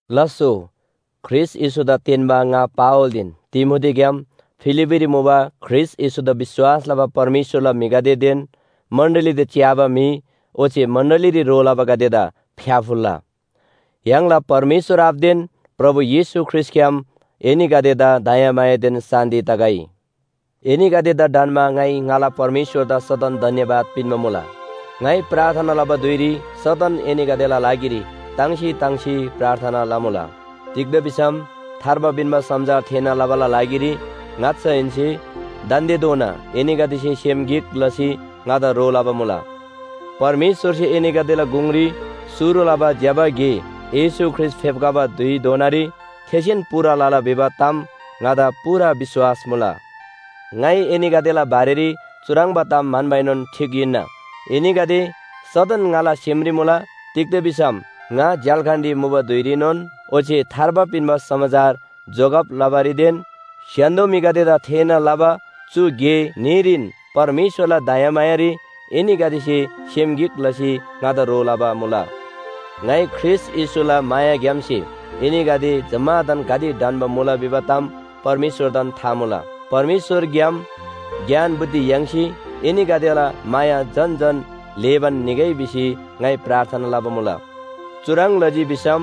लास्‍सो, ख्रीष्‍ट येशूदा तेन्‍बा ङा पावलदेन तिमोथीग्‍याम फिलिप्‍पीरी मुबा ख्रीष्‍ट येशूदा विश्‍वास लबा परमेश्‍वरला म्‍हिगदेदेन मण्‍डलीदा च्‍याबा म्‍हि ओच्‍छे मण्‍डलीरी ह्रो लबागदेदा फ्‍याफुल्‍ला! य्‍हाङला परमेश्‍वर आबादेन प्रभु येशू ख्रीष्‍टग्‍याम एनीगदेदा दयामायादेन शान्‍ति तगै। एनीगदेदा ढन्‍मा ङाइ ङाला परमेश्‍वरदा सदन धन्‍यवाद पिन्‍बा मुला। ङाइ प्रार्थना लबा धुइरी सदन एनीगदेला लागिरी ताङ्सी ताङ्सी प्रार्थना लमुला। तिग्‍दा भिसम थार्बा पिन्‍बा समाचार थेःना लबाला लागिरी ङाच्‍छाहेन्‍से दान्‍देधोना एनीगदेसे सेम गिक लसी ङादा ह्रो लबा मुला। परमेश्‍वरसे एनीगदेला गुङरी शुरु लबा ज्‍यबा गे येशू ख्रीष्‍ट फेप्‍खबा धुइधोनारी थेसेन पूरा लला भिबा ताम ङादा पूरा विश्‍वास मुला। ङाइ एनीगदेला बारेरी चुह्रङ्बा ताम म्‍हन्‍बाएनोन ठीक हिन्‍ना। एनीगदे सदन ङाला सेमरी मुला। तिग्‍दा भिसम ङा झ्‍याल्‍खानरी मुबा धुइरीनोन ओच्‍छे थार्बा पिन्‍बा समाचार जोगब लबारीदेन स्‍य्‍हान्‍दो म्‍हिगदेदा थेःना लबा चु गे न्‍हीरीन परमेश्‍वरला दयामायारी एनीगदेसे सेम गिक लसी ङादा ह्रो लबा मुला। ङाइ ख्रीष्‍ट येशूला मायाग्‍यामसे एनीगदे जम्‍मादान गाते ढन्‍बा मुला भिबा ताम परमेश्‍वरदान था मुला। परमेश्‍वरग्‍याम ज्ञान बुद्धि याङ्सी एनीगदेला माया झन झन ल्‍हेबान निगै भिसी ङाइ प्रार्थना लबा मुला। चुह्रङ् लजी भिसम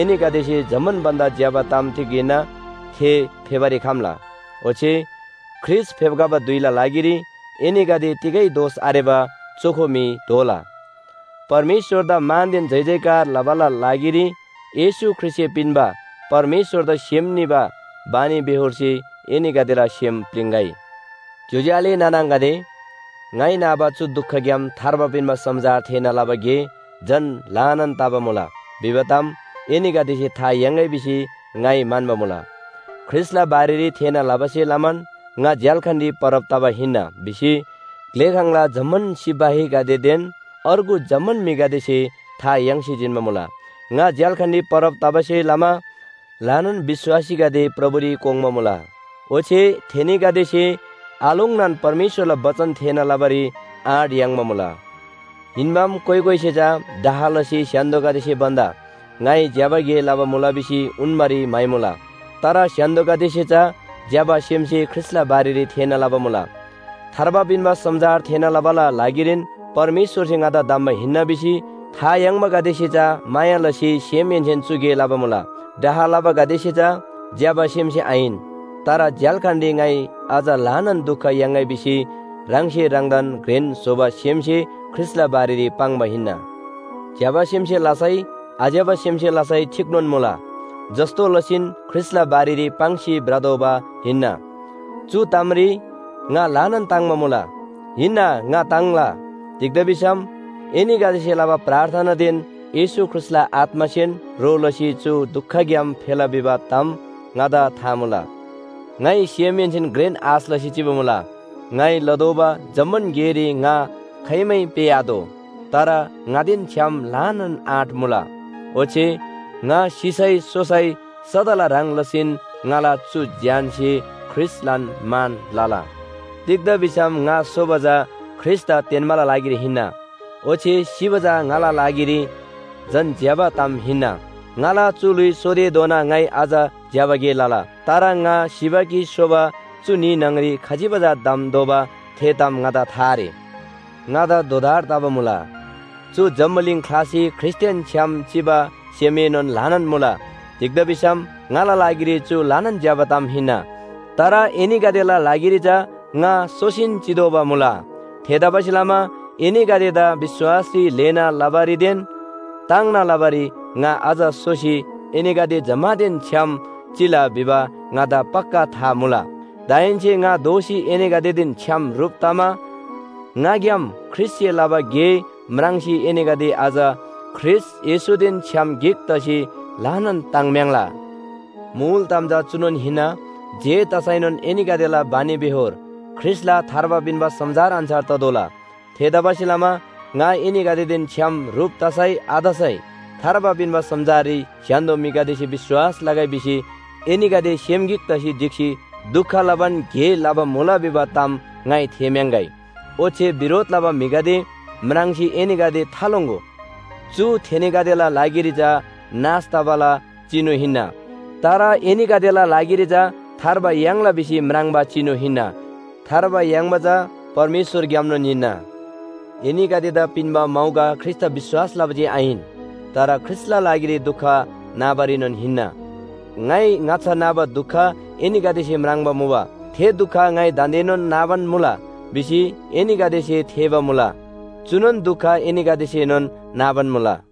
एनीगदेसे जम्‍मान भन्‍दा ज्‍यबा ताम तिग हिन्‍ना, थे फेबारी खम्‍ला। ओच्‍छे ख्रीष्‍ट फेप्‍खबा धुइला लागिरी एनीगदे तिगै दोष आरेबा चोखो म्‍हि दोला। परमेश्‍वरदा मानदेन जयजयकार लबाला लागिरी येशू ख्रीष्‍टसे पिन्‍बा परमेश्‍वरदा सेम निबा बानीबेहोरसे एनीगदेला सेम प्‍लिङ्‌गै। ज्‍योज्‍यो आले नाना आङागदे, ङाइ नाबा चु दुखग्‍याम थार्बा पिन्‍बा समाचार थेःना लबा गे झन ल्‍हानान तबा मुला भिबा ताम एनीगदेसे था याङ्‌गै भिसी ङाइ म्‍हन्‍बा मुला। ख्रीष्‍टला बारेरी थेःना लबासे लमान ङा झ्‍याल्‍खानरी परब तबा हिन्‍ना भिसी ग्‍लेखाङला जम्‍मान सिपाहीगदेदेन अर्गु जम्‍मान म्‍हिगदेसे था याङ्सी जिन्‍बा मुला। ङा झ्‍याल्‍खानरी परब तबासे लमा ल्‍हानान विश्‍वासीगदे प्रभुरी कोङ्बा मुला। ओच्‍छे थेनीगदेसे आलोङ्नान परमेश्‍वरला बचन थेःना लबारी आँट याङ्बा मुला। हिन्‍बाम कोइ कोइसे चा डाह लसी स्‍य्‍हान्‍दोसे भन्‍दा ङाइ ज्‍यबा गे लबा मुला भिसी उन्‍बारी म्‍हाइमुला, तर स्‍य्‍हान्‍दोगदेसे चा ज्‍यबा सेमसे ख्रीष्‍टला बारेरी थेःना लबा मुला। थार्बा पिन्‍बा समाचार थेःना लबाला लागिरीन परमेश्‍वरसे ङादा धम्‍बा हिन्‍ना भिसी था याङ्बागदेसे चा माया लसी सेमहेन्‍सेन चु गे लबा मुला। डाह लबागदेसे चा ज्‍यबा सेमसे आहिन। तर झ्‍याल्‍खानरी ङाइ अझ ल्‍हानान दुख याङ्‌गै भिसी ह्राङसे ह्राङदान घ्रेन स्‍होबा सेमसे ख्रीष्‍टला बारेरी पाङ्बा हिन्‍ना। ज्‍यबा सेमसे लसै आज्‍यबा सेमसे लसै ठीकनोन मुला, जस्‍तो लसीन ख्रीष्‍टला बारेरी पाङ्सी भ्रतोःबा हिन्‍ना। चु तामरी ङा ल्‍हानान ताङ्‍बा मुला। हिन्‍ना ङा ताङ्ला। तिग्‍दा भिसम एनीगदेसे लबा प्रार्थनादेन येशू ख्रीष्‍टला आत्‍मासेन ह्रो लसी चु दुखग्‍याम फेला भिबा ताम ङादा था मुला। ङाइ सेमहेन्‍सेन घ्रेन आश लसी चिबा मुला, ङाइ लतोःबा जम्‍मान गेरी ङा खाइमै पेःआतोः। तर ङादेन छ्‌याम ल्‍हानान आँट मुला। ओच्‍छे ङा सिसै सोसै सदाला ह्रङ् लसीन ङाला चु ज्‍यानसे ख्रीष्‍टलान मान लला। तिग्‍दा भिसम ङा सोबा चा ख्रीष्‍टदा तेन्‍बाला लागिरी हिन्‍ना। ओच्‍छे सिबा चा ङाला लागिरी झन ज्‍यबा ताम हिन्‍ना। ङाला चु ल्‍हुइ सोतेधोना ङाइ अझ ज्‍यबा गे लला। तर ङा सिबा कि सोबा चु न्‍ही न्‍हङरी खजिबा चा धम्‍तोःबा थे ताम ङादा था आरे। ङादा दोधार तबा मुला। चु जम्‍बुलिङ ख्‍लासी ख्रीष्‍टदेन छ्‌याम चिबा सेमएनोन ल्‍हानान मुला। तिग्‍दा भिसम ङाला लागिरी चु ल्‍हानान ज्‍यबा ताम हिन्‍ना। तर एनीगदेला लागिरी चा ङा सोसीन चितोःबा मुला। थेतबासेलमा एनीगदेदा विश्‍वासरी ल्‍हेना लबारीदेन ताङ्ना लबारी ङा अझ सोसी एनीगदे जम्‍मानदेन छ्‌याम चिला भिबा ङादा पक्‍का था मुला। दाहेन्‍से ङा दोःसी एनीगदेदेन छ्‌याम ह्रुप तमा ङाग्‍याम ख्रीष्‍टसे लबा गे म्राङ्सी एनीगदे अझ ख्रीष्‍ट येशूदेन छ्‌याम गिक तसी ल्‍हानान ताङ्म्‍याङ्ला। मुल ताम चा चुनोन हिन्‍ना, जे तसैनोन एनीगदेला बानीबेहोर ख्रीष्‍टला थार्बा पिन्‍बा समाचार अन्‍छार ततोःला। थेतबासेलमा ङा एनीगदेदेन छ्‌याम ह्रुप तसै आतसै थार्बा पिन्‍बा समाचाररी स्‍य्‍हान्‍दो म्‍हिगदेसे विश्‍वास लगै भिसी एनीगदे सेम गिक तसी ढिक्‍सी दुख लबान गे लबा मुला भिबा ताम ङाइ थेःम्‍याङ्‍गै। ओच्‍छे बिरोध लबा म्‍हिगदे म्राङ्सी एनीगदे थालोङ्‍गो। चु थेनीगदेला लागिरी चा नाश तबाला चिनु हिन्‍ना। तर एनीगदेला लागिरी चा थार्बा याङ्ला भिसी म्राङ्बा चिनु हिन्‍ना। थार्बा याङ्बा चा परमेश्‍वरग्‍यामनोन हिन्‍ना। एनीगदेदा पिन्‍बा मौका ख्रीष्‍टदा विश्‍वास लबा जे आहिन, तर ख्रीष्‍टला लागिरी दुख नाबारीनोन हिन्‍ना। ङाइ ङाच्‍छा नाबा दुख एनीगदेसे म्राङ्बा मुबा, थे दुख ङाइ दान्‍देनोन नाबान मुला भिसी एनीगदेसे थेःबा मुला। चुनोन दुख एनीगदेसेनोन नाबान मुला।